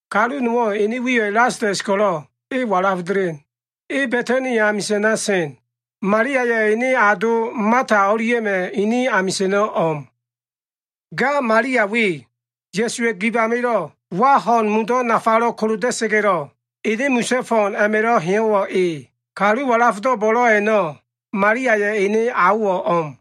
Kalu nowo꞉ ene wiyo꞉ Lasalas ko꞉lo꞉ e walaf delen. E Ba꞉tani amisa꞉na sen. Maliaya꞉ ene ado Mata o꞉lia꞉ma꞉ ini amisa꞉no꞉ o꞉m. Ga Malia we, Ya꞉suwa꞉ gib amilo꞉ wa ho꞉n mundo꞉ nafalo꞉ koloda꞉sa꞉ga꞉lo꞉, ene misa꞉ fo꞉n a꞉ma꞉lo꞉ heyo꞉wo꞉ e. Kalu walafdo꞉ bo꞉lo꞉ a꞉no꞉, Maliaya꞉ ene aowo꞉ o꞉m.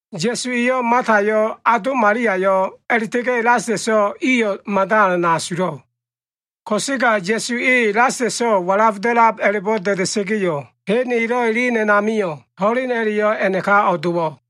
Ya꞉su eyo꞉ Matayo꞉, ado Maliayo꞉, a꞉la꞉ta꞉ga꞉ Lasalaso꞉ iyo꞉ mada alan asulo꞉. Ko꞉sega Ya꞉su e Lasalaso꞉ walaf da꞉lab a꞉la꞉bo꞉ da꞉da꞉sa꞉ga꞉yo꞉, hen elo꞉ elen a꞉namio꞉, ho꞉len a꞉la꞉yo꞉ a꞉naka o꞉dowo꞉.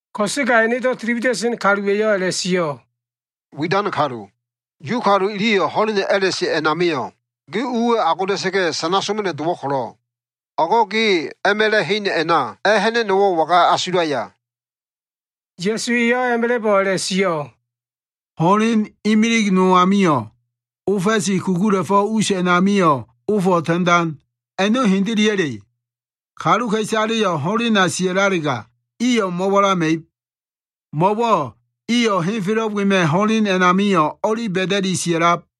Ko꞉sega enedo꞉ tili wida꞉sen kaluwa꞉yo꞉ a꞉la꞉sio꞉, “Widan kalu, Yu kalu iliyo꞉ ho꞉leno꞉ a꞉la꞉se a꞉namio꞉ ge uwa꞉ agoda꞉sa꞉ga꞉ sana soma꞉no꞉ dowo꞉ ko꞉lo꞉, o꞉go꞉ ge a꞉ma꞉la꞉ hen a꞉na a꞉ha꞉na꞉no꞉wo꞉ waga asulaya?” Ya꞉su eyo꞉ a꞉ma꞉la꞉bo꞉ a꞉la꞉sio꞉, “Ho꞉len imilig no amio꞉, ofa꞉si kugula꞉fo꞉ us a꞉namio꞉ ofo꞉ ta꞉ndan, a꞉no꞉ hendeleya꞉le? Kaluka꞉isaleyo꞉ ho꞉lena sia꞉lalega, iyo꞉ mo꞉walama꞉ib. Mo꞉wo꞉ iyo꞉ henfelo꞉ wema꞉ ho꞉len a꞉namio꞉ o꞉li ba꞉da꞉liki sia꞉lab.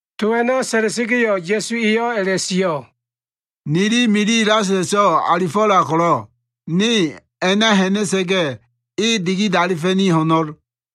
To a꞉no꞉ sa꞉la꞉sa꞉ga꞉yo꞉, Ya꞉su eyo꞉ a꞉la꞉sio꞉, “Nili mili Lasalaso꞉ alifo꞉lab ko꞉lo꞉, ne a꞉na ha꞉na꞉sa꞉ga꞉, e dikidalifa꞉ni ho꞉no꞉l.”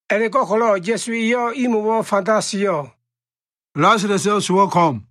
A꞉la꞉go꞉ko꞉lo꞉ Ya꞉su eyo꞉ imo꞉wo꞉ fanda sio꞉, “Lasalaso꞉ sowo꞉ ko꞉m.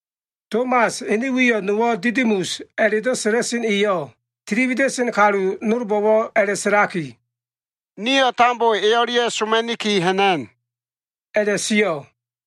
Tomas, ene wiyo꞉ nowo꞉ Didimus a꞉la꞉do꞉ sa꞉la꞉sen eyo꞉, tili wida꞉sen kalu nolbo꞉wo꞉ a꞉la꞉sa꞉laki, “Nio꞉ tambo e o꞉lia꞉ soma꞉niki ha꞉na꞉n” a꞉la꞉sio꞉.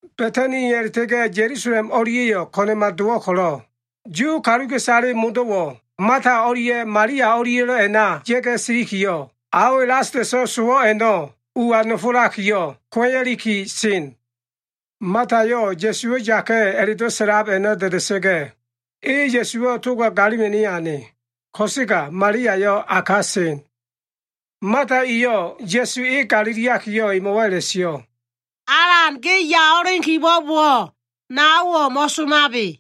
Ba꞉tani a꞉la꞉ta꞉ga꞉ Ya꞉lusalem o꞉lia꞉yo꞉ ko꞉na꞉ma dowo꞉ ko꞉lo꞉, Yu kaluka꞉isale modo꞉wo꞉ Mata o꞉lia꞉ Malia o꞉lia꞉lo꞉ a꞉na ya꞉ga꞉ siliki, ao Lasalas sowo꞉ a꞉no꞉ ua nofolaki, kuo꞉ya꞉liki sen. Matayo꞉ Ya꞉suwo꞉ yaka꞉ a꞉la꞉do꞉ sa꞉lab a꞉no꞉ da꞉da꞉sa꞉ga꞉, e Ya꞉suwo꞉ toga galima꞉no꞉ ane. Ko꞉sega Maliayo꞉ a ka sen. Mata eyo꞉ Ya꞉su e galiliakiyo꞉ emo꞉wo꞉ a꞉la꞉sio꞉, “Alan, ge ya o꞉elen kibo꞉bowo꞉, naowo꞉ mo꞉somabe.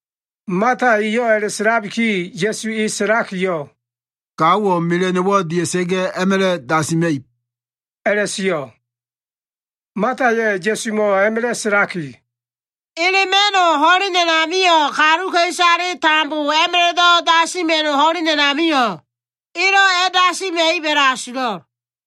Mata eyo꞉ a꞉la꞉sa꞉labiki, Ya꞉su e sa꞉lakiyo꞉, “Gaowo꞉ mela꞉no꞉wo꞉ dia꞉sa꞉ga꞉ a꞉ma꞉la꞉ dasima꞉ib” a꞉la꞉sio꞉. Mataya꞉ Ya꞉sumo꞉ a꞉ma꞉la꞉ sa꞉laki, “Elema꞉no꞉ ho꞉len amio꞉, kaluka꞉isale tambo a꞉ma꞉la꞉do꞉ dasima꞉ib ho꞉len a꞉namio꞉, elo꞉ a꞉dasima꞉ib a꞉la꞉asulo꞉l.”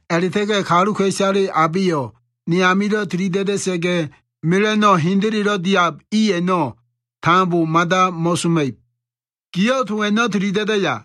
A꞉la꞉ta꞉ga꞉ kaluka꞉isale abeyo꞉ ne amilo꞉ tilida꞉da꞉sa꞉ga, mela꞉no꞉ hendelelo꞉ diab i a꞉no꞉ tambo mada mo꞉soma꞉ib. Giyo꞉ to a꞉no꞉ tili da꞉daya?”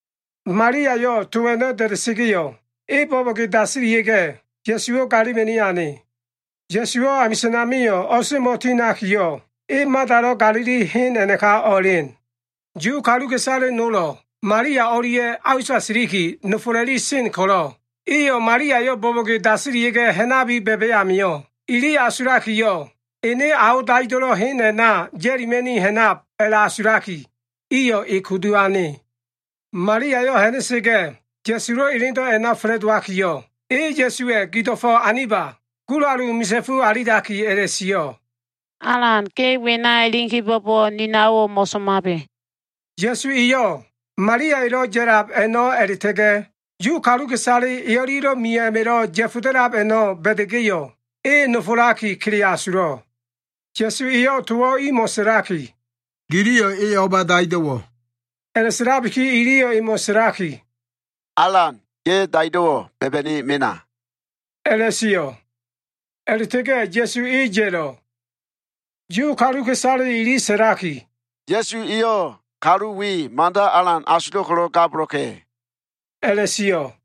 Maliayo꞉ to a꞉no꞉ da꞉da꞉sa꞉ga꞉yo꞉, e bo꞉bo꞉ge dasilia꞉ga꞉, Ya꞉suwo꞉ galima꞉ni ane. Ya꞉suwo꞉ amisa꞉n amio꞉ o꞉semo꞉ tinakiyo꞉, e Matalo꞉ galili hen a꞉naka o꞉elen. Yu kaluka꞉isale nolo꞉ Malia o꞉lia꞉ a usa siliki nofola꞉li sen ko꞉lo꞉, iyo꞉ Maliayo꞉ bo꞉bo꞉ge dasilia꞉ga꞉ ha꞉nabi ba꞉ba꞉ amio꞉, ili asulakiyo꞉ ene ao daido꞉lo꞉ hen a꞉na ya꞉lima꞉ni ha꞉nab a꞉la꞉asulaki, iyo꞉ e kudu ane. Maliayo꞉ ha꞉na꞉sa꞉ga꞉ Ya꞉sulo꞉ elendo꞉ a꞉na fa꞉la꞉dowakiyo꞉, e Ya꞉suwa꞉ gido꞉fo꞉ aniba gulalu misa꞉fu alilaki a꞉la꞉sio꞉, “Alan, ge wena elen kibo꞉bowo꞉, ni naowo꞉ mo꞉somabe.” Ya꞉su eyo꞉ Maliaya꞉lo꞉ ya꞉lab a꞉no꞉ a꞉la꞉ta꞉ga꞉ Yu kaluka꞉isale e o꞉lia꞉lo꞉ mio꞉ a꞉ma꞉lo꞉ ya꞉foda꞉lab a꞉no꞉ ba꞉da꞉ga꞉yo꞉, e nofolaki kele asulo꞉. Ya꞉su eyo꞉ towo꞉ imo꞉ sa꞉laki, “Giliyo꞉ e o꞉ba daido꞉wo꞉?” A꞉la꞉sa꞉labiki iliyo꞉ emo꞉ sa꞉laki, “Alan, ge daido꞉wo꞉ ba꞉ba꞉ni mena” a꞉la꞉sio꞉. A꞉la꞉ta꞉ga꞉ Ya꞉su e ya꞉lo꞉. Yu kaluka꞉isale ili sa꞉laki, “Ya꞉su eyo꞉ kalu we mada alan asulo꞉ ko꞉lo꞉ gabolo꞉ka꞉” a꞉la꞉sio꞉.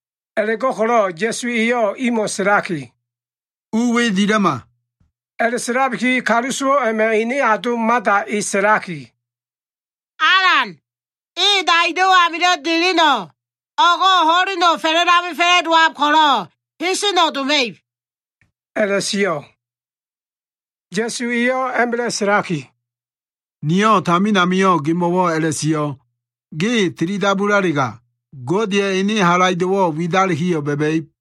A꞉la꞉go꞉ko꞉lo꞉ Ya꞉su eyo꞉ imo꞉ sa꞉laki, “U we dila꞉ma.” A꞉la꞉sa꞉labiki kalu sowo꞉ a꞉ma꞉ ene ado Mata e sa꞉laki, “Alan, e daido꞉ amilo꞉ deleno꞉, o꞉go꞉ ho꞉leno꞉ fa꞉la꞉lamel fa꞉la꞉dowab ko꞉lo꞉, heseno꞉ doma꞉ib” a꞉la꞉sio꞉. Ya꞉su eyo꞉ a꞉ma꞉la꞉ sa꞉laki, “Niyo꞉ tamin amio꞉ gemo꞉wo꞉ a꞉la꞉sio꞉, ‘Ge tili dabulalega, Godeya꞉ ene halaido꞉wo꞉ widalikiyo꞉ ba꞉ba꞉ib.’”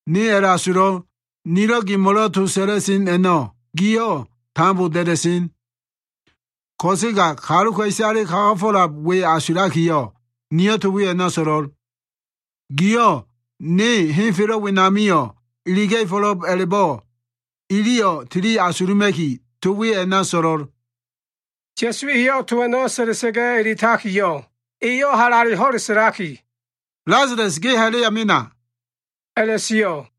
Niyo꞉ a꞉la꞉asulo꞉l. Nilo꞉ gemo꞉lo꞉ to sa꞉la꞉sen a꞉no꞉ giyo꞉ tambo da꞉da꞉sen. Ko꞉sega kaluka꞉isale kagafo꞉lab i we asulakiyo꞉, niyo꞉ to we a꞉na so꞉lo꞉l. Giyo꞉ ne henfelo꞉ wenamio꞉ iliga꞉fo꞉lo꞉b a꞉la꞉bo꞉ iliyo꞉ tili asuluma꞉ki, to we a꞉na so꞉lo꞉l.” Ya꞉su eyo꞉ to a꞉no꞉ sa꞉la꞉sa꞉ga꞉ eletakiyo꞉, eyo꞉ halale ho꞉le sa꞉laki, “Lasalas, ge ha꞉la꞉ya mena” a꞉la꞉sio꞉.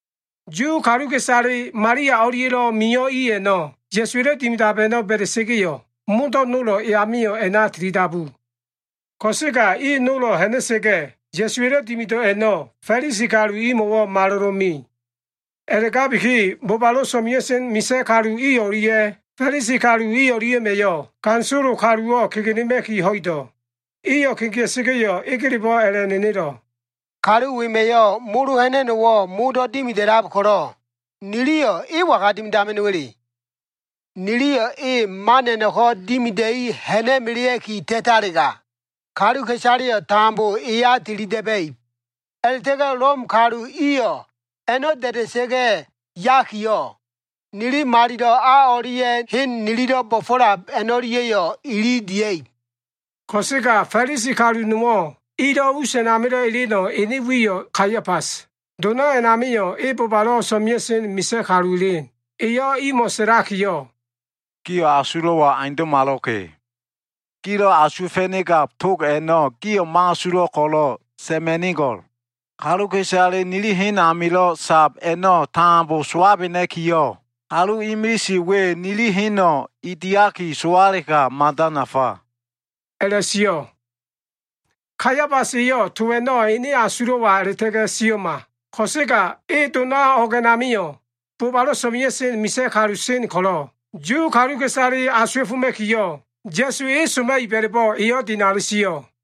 Yu kaluka꞉isale Malia o꞉lia꞉lo꞉ mio꞉ i a꞉no꞉ Ya꞉suwa꞉lo꞉ dimidab a꞉no꞉ ba꞉da꞉sa꞉ga꞉yo꞉, modo꞉ nolo꞉ e amio꞉ a꞉na tilidabu. Ko꞉sega i nolo꞉ ha꞉na꞉sa꞉ga꞉, Ya꞉suwa꞉lo꞉ dimido꞉ a꞉no꞉ Fa꞉lisi kalu imo꞉wo꞉ malolo꞉ me. A꞉la꞉gabiki bobalo꞉ so꞉mea꞉sen misa꞉ kalu i o꞉lia꞉ Fa꞉lisi kalu i o꞉lia꞉ma꞉yo꞉ ganisolo kaluwo꞉ kegenema꞉ki ho꞉ido꞉. Iyo꞉ kegea꞉sa꞉ga꞉yo꞉, egelebo꞉ a꞉la꞉nenelo꞉, “Kalu wema꞉yo꞉ molo ha꞉na꞉no꞉wo꞉ modo꞉ dimida꞉lab ko꞉lo꞉, niliyo꞉ e waga dimidama꞉no꞉wa꞉le? Niliyo꞉ e man o꞉leo꞉ngo꞉ a꞉no꞉ko꞉ dimida꞉i ha꞉na꞉melea꞉ki ta꞉talega, kaluka꞉isaleyo꞉ tambo eya tili da꞉ba꞉ib. A꞉la꞉ta꞉ga꞉ Lom kalu iyo꞉ a꞉no꞉ da꞉da꞉sa꞉ga꞉ yakiyo꞉, nili malilo꞉ a o꞉lia꞉ nililo꞉ hen bo꞉fo꞉lab o꞉lia꞉yo꞉ ili dia꞉ib.” Ko꞉sega Fa꞉lisi kalu nowo꞉ ilo꞉ us a꞉namilo꞉ eleno꞉ ene wiyo꞉ Kaiafas. Dona a꞉namio꞉ e bobalo꞉ so꞉mea꞉sen misa꞉ kalu elen. Eyo꞉ imo꞉ sa꞉lakiyo꞉, “Gio꞉ asulo꞉wo꞉ aundo꞉malo꞉ka꞉. Gilo꞉ asuwa꞉fa꞉nigab tog a꞉no꞉ gio꞉ mo꞉asulo꞉ ko꞉lo꞉ sa꞉ma꞉nigo꞉l. Kaluka꞉isale nili hen amilo꞉ sab a꞉no꞉ tambo sowabena꞉kiyo꞉, kalu imilise we nili heno꞉ e diaki sowalega, mada nafa” a꞉la꞉sio꞉. Kaiafas eyo꞉ to a꞉no꞉ ene asulo꞉wa a꞉la꞉ta꞉ga꞉ sio꞉ma. Ko꞉sega e dona o꞉g a꞉namio꞉ bobalo꞉ so꞉mea꞉sen misa꞉ kalu sen ko꞉lo꞉, Yu kaluka꞉isale asuwa꞉foma꞉kiyo꞉, Ya꞉su e soma꞉ib a꞉la꞉bo꞉ eyo꞉ dinali sio꞉.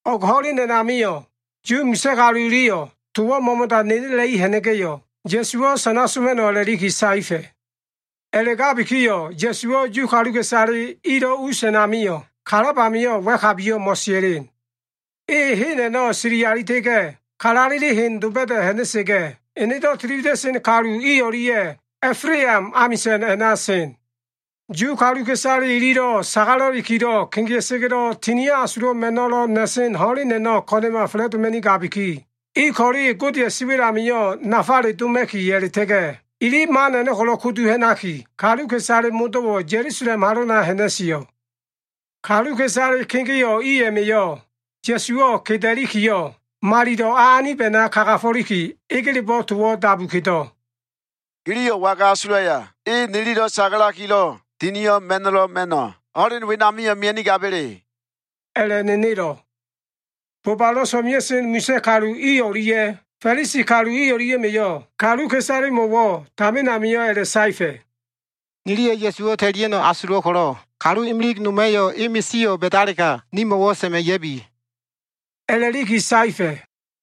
O꞉g ho꞉len a꞉namio꞉ Yu misa꞉ kalu iliyo꞉ towo꞉ mo꞉mo꞉da nenela꞉i ha꞉na꞉ga꞉yo꞉, Ya꞉suwo꞉ sana soma꞉no꞉ a꞉la꞉liki saefa꞉. A꞉la꞉gabikiyo꞉ Ya꞉suwo꞉ Yu kaluka꞉isale ilo꞉ us a꞉namio꞉ kalab amio꞉ wa꞉kabiyo꞉ mo꞉sia꞉len. E hen a꞉no꞉ sili alita꞉ga꞉, kalaleli hen doba꞉da꞉ ha꞉na꞉sa꞉ga꞉, enedo꞉ tili wida꞉sen kalu i o꞉lia꞉ A꞉flam amisa꞉n a꞉na sen. Yu kaluka꞉isale ililo꞉ sagala꞉likilo꞉ kegea꞉sa꞉ga꞉lo꞉ Tinio꞉ Asulo꞉ ma꞉no꞉lo꞉ na꞉sen ho꞉len a꞉no꞉ ko꞉na꞉ma fa꞉la꞉doma꞉nigabiki, i ko꞉le Godeya꞉ siwa꞉l amio꞉ nafale doma꞉ki a꞉la꞉ta꞉ga꞉, ili man a꞉no꞉ ko꞉lo꞉ kudu ha꞉naki, kaluka꞉isale modo꞉wo꞉ Ya꞉lusalem halona ha꞉na꞉sio꞉. Kaluka꞉isale kegeo꞉ i a꞉ma꞉yo꞉ Ya꞉suwo꞉ keda꞉likiyo꞉, malilo꞉ a anib a꞉na kagafo꞉liki egelebo꞉ towo꞉ dabu kedo꞉, “Giliyo꞉ waga asulaya? E nililo꞉ sagalakilo꞉ Tinio꞉ Ma꞉no꞉lo꞉ ma꞉no꞉ ho꞉len wenamio꞉ mia꞉nigaba꞉le?” a꞉la꞉nenelo꞉. Bobalo꞉ so꞉mea꞉sen misa꞉ kalu i o꞉lia꞉ Fa꞉lisi kalu i o꞉lia꞉ma꞉yo꞉ kaluka꞉isalemo꞉wo꞉ tamin amio꞉ a꞉la꞉saefa꞉, “Niliyo꞉ Ya꞉suwo꞉ ta꞉lia꞉no꞉ asulo꞉ ko꞉lo꞉, kalu imilig noma꞉yo꞉ e misio꞉ ba꞉dalega, nimo꞉wo꞉ sa꞉ma꞉ ya꞉bi” a꞉la꞉liki saefa꞉.